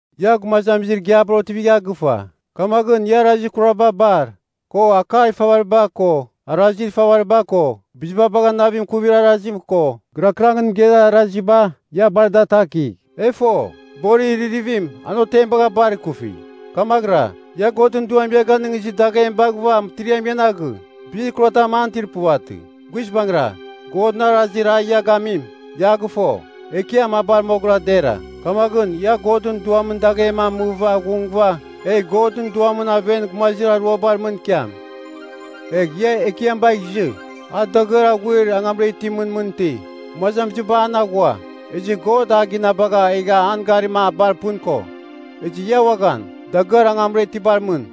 Ia gumazamizir igiabar otivigha gɨfa, kamaghɨn ia arazir kuraba bar, ko akar ifavariba ko, arazir ifavariba ko, biziba bagha navim ikuvir arazim ko, gɨrakɨrangɨn mɨgeir araziba, ia bar da atakigh. E fo, borir iririvim an otem bagha bar kufi. Kamaghɨra, ia Godɨn Duam ia ganɨngizir daghem baghɨva mɨtiriam ian aghɨ, bizir kuratam an itir puvatɨ. Guizbangɨra, Godɨn arazir a ia gamim, ia a gɨfo, Ekiam a bar moghɨra dera. Kamaghɨn ia Godɨn Duamɨn daghem amɨva aghungɨva egh Godɨn Duamɨn aven gumazir aruabar mɨn ikiam. Egh ia Ekiam bagh izɨ, a dagɨar aghuir angamra itimɨn mɨn iti. Gumazamiziba an aghua, ezɨ God a ginabagha egha an garima a bar pɨn ko. Ezɨ ia uaghan, dagɨar angamra itibar mɨn.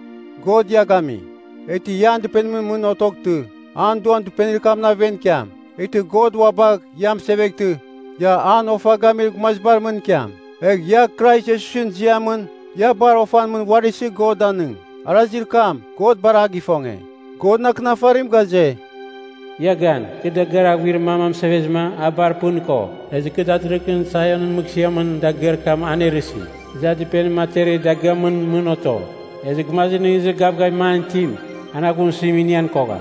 God ia gami, eghtɨ ia dɨpenimɨn mɨn otoghtɨ, an Duam dɨpenir kamɨn aven ikiam. Eghtɨ God ua bagh ia mɨseveghtɨ, ia an ofa gamir gumazibar mɨn ikiam. Egh ia Krais Iesusɨn ziamɨn ia bar ofan mɨn uari isɨ God danɨng. Arazir kam, God bar a gifonge. Godɨn Akɨnafarim ghaze, “Ia gan. Kɨ dagɨar aghuir mam amɨsevezɨma a bar pɨn ko. Ezɨ kɨ datɨrɨghɨn Sionɨn mɨghsɨamɨn dagɨar kam anerɨsi. Ezɨ a dɨpenim aterir dagɨamɨn mɨn oto. Ezɨ gumazir nɨghnɨzir gavgavim an itim, an aghumsɨzim inian kogham.”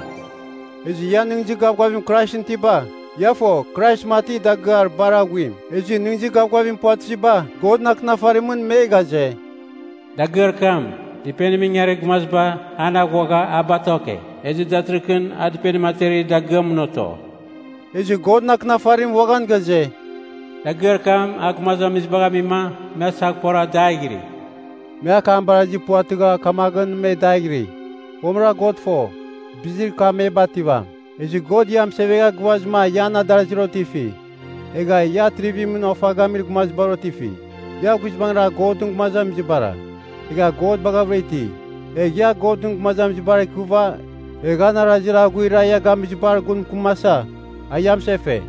Ezɨ ia nɨghnɨzir gavgavim Kraisɨn itiba, ia fo Krais mati dagɨar bar aghuim. Ezɨ nɨghnɨzir gavgavim puvatɨziba, Godɨn Akɨnafarimɨn me ghaze, “Dagɨar kam, dɨpenimɨn ingarir gumaziba, an aghuagha a batoke, ezɨ datɨrɨghɨn a dɨpenim aterir dagɨamɨn oto.” Ezɨ Godɨn Akɨnafarim uaghan ghaze, “Dagɨar kam a gumazamizibagh amima, me asaghpora daighiri.” Me akam barazir puvatɨgha kamaghɨn, me daighiri. Fomɨra God fo, bizir kam me bativam. Ezɨ God ia mɨsevegha gɨvazɨma ia an adarazir otifi. Egha ia atrivimɨn ofa gamir gumazibar otifi. Ia guizbangɨra Godɨn gumazamizibara, egha God baghavɨra iti. Egh ia Godɨn gumazamizibar ikɨva egh an arazir aghuir a ia gamizibar gun mɨkɨmasa, ia mɨsefe.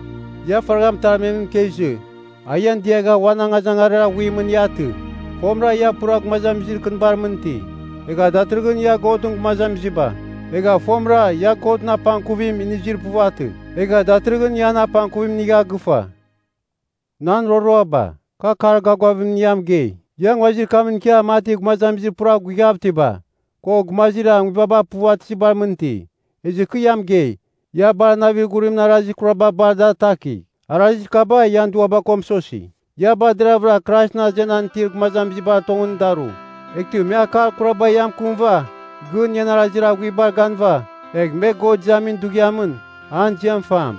Ia faragha mɨtarmemɨn ikezɨ, a ian diagha uan angazangarir aghuimɨn ia atɨ. Fomɨra ia pura gumazamizir kɨnibar mɨn iti, egha datɨrɨghɨn ia Godɨn gumazamiziba. Egha fomɨra ia Godɨn apangkuvim inizir puvatɨ, egha datɨrɨghɨn ia an apangkuvim inigha gɨfa. Nan roroaba, kɨ akar gavgavimɨn ia mɨgei, ia nguazir kamɨn ikia mati gumazamizir pura guighav itiba, ko gumazir nguibaba puvatɨzibar mɨn iti. Ezɨ kɨ ia mɨgei, ia bar navir ghurimɨn arazir kuraba bar ada atakigh. Arazir kaba ian duaba ko mɨsosi. Ia bar deraghvɨra Kraisɨn azenan itir gumazibar tongɨn daru. Eghtɨ me akar kuraba ia mɨkɨmɨva, gɨn ian arazir aghuibar ganɨva, egh me God izamin Dughiamɨn, an ziam fam.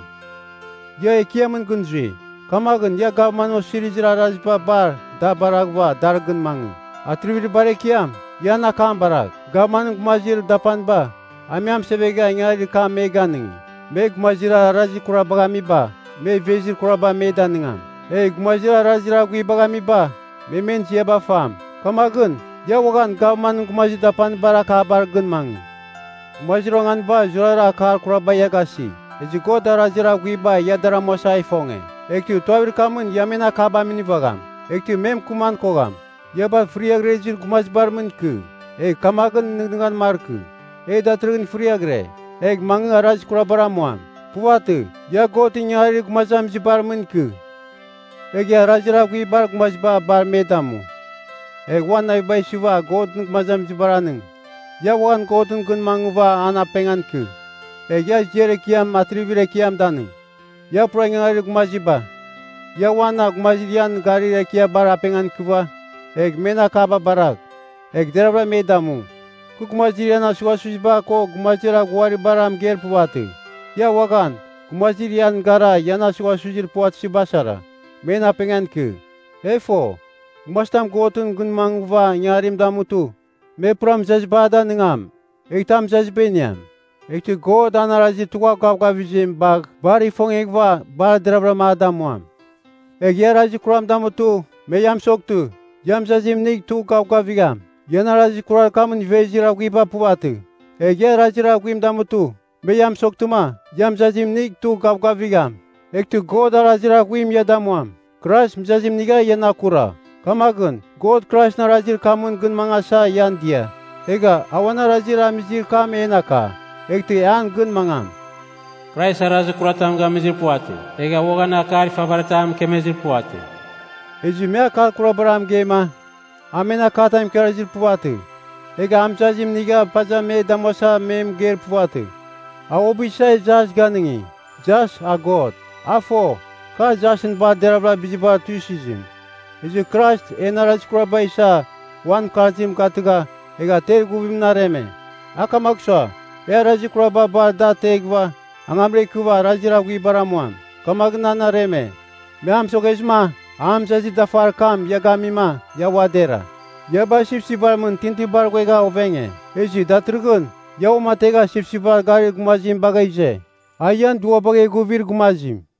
Ia Ekiamɨn gɨn zui, kamaghɨn ia gavman osirizir araziba bar da baraghɨva dar gɨn mangɨ. Atrivir bar ekiam, ia an akam baragh. Gavmanɨn gumazir dapaniba, a me amɨsevegha ingangarir kam me ganɨngi, me gumazir arazir kurabagh amiba me ivezir kuraba me danɨngam. Egh gumazir arazir aghuibagh amiba, me men ziaba fam. Kamaghɨn ia uaghan gavman gumazir dapanibar akabar gɨn mangɨ. Gumazir onganiba zurara akar kuraba ia gasi. Ezɨ God arazir aghuiba ia dar amuasa a ifonge, eghtɨ tuavir kamɨn ia men akaba minivagham, eghtɨ me mɨkɨman kogham. Ia bar fɨriaghrɨzir gumazibar mɨn ikɨ. Egh kamaghɨn nɨghnɨghan markɨ, “E datɨrɨghɨn fɨriaghɨre, egh mangɨ arazir kurabar amuam.” Puvatɨ. Ia Godɨn ingangarir gumazamizibar mɨn ikɨ. Egh ia arazir aghuibar gumaziba bar me damu: Egh uan naviba isɨva Godɨn gumazamizibar anɨng. Ia uaghan Godɨn gɨn mangɨva an apengan ikɨ. Egh ia ziar ekiam atrivir ekiam danɨng. Ia pura ingangarir gumaziba, ia uan gumazir ian garir ekiabar apengan ikɨva, egh men akaba baragh, egh deraghvɨra me damu. Kɨ gumazir ian asughasuziba ko gumazir aghuibara mɨgeir puvatɨ, ia uaghan, gumazir ian gara ian asughasuzir puvatɨziba sara, men apengan ikɨ. E fo, gumazitam Godɨn gɨn mangɨva ingangarim damutɨ, me pura mɨzaziba a danɨngam, eghtɨ a mɨzaziba iniam, eghtɨ God an arazir tugha gavgavizim bagh bar ifongeghɨva, bar deraghvɨra a damuam. Egh ia arazir kuram damutɨ me ia mɨsoghtɨ, ia mɨzazim inigh tugh gavgavigham, ian arazir kurar kamɨn ivezir aghuiba puvatɨ. Egh ia arazir aghuim damutɨ, me ia mɨsoghtɨma ia mɨzazim inigh tugh gavgavigham, eghtɨ God arazir aghuim ia damuam. Krais mɨzazim inigha ian akura, kamaghɨn God Kraisɨn arazir kamɨn gɨn mangasa ian dia. Egha a uan arazir amizir kam en aka, eghtɨ e an gɨn mangam. “Krais arazir kuratam gamizir puvatɨ, egha uaghan akar ifavaritam mɨkemezir puvatɨ.” Ezɨ me akar kurabar a mɨgeima, a men akatam ikarazir puvatɨ, egha a mɨzazim inigha paza me damuasa me mɨgeir puvatɨ. A uabɨ isa jas ganɨngi, jas a God. A fo, kar jasɨn bar deravɨra bizibar tuisɨzim. Ezɨ Krais en arazir kuraba isa uan mɨkarzim gatɨgha, egha ter ighuvimɨn areme. A kamagh sua, e arazir kuraba bar ada ateghɨva, angamra ikɨva arazir aghuibar amuam, kamaghɨn an areme. Me a mɨsoghezɨma an mɨzazir dafar kam ia gamima, ia ua dera. Ia bar sipsipbar mɨn tintinibar ghuegha ovenge. Ezɨ datɨrɨghɨn ia uamategha sipsipbar garir gumazim bagha ize, a ian duabagh eghuvir gumazim.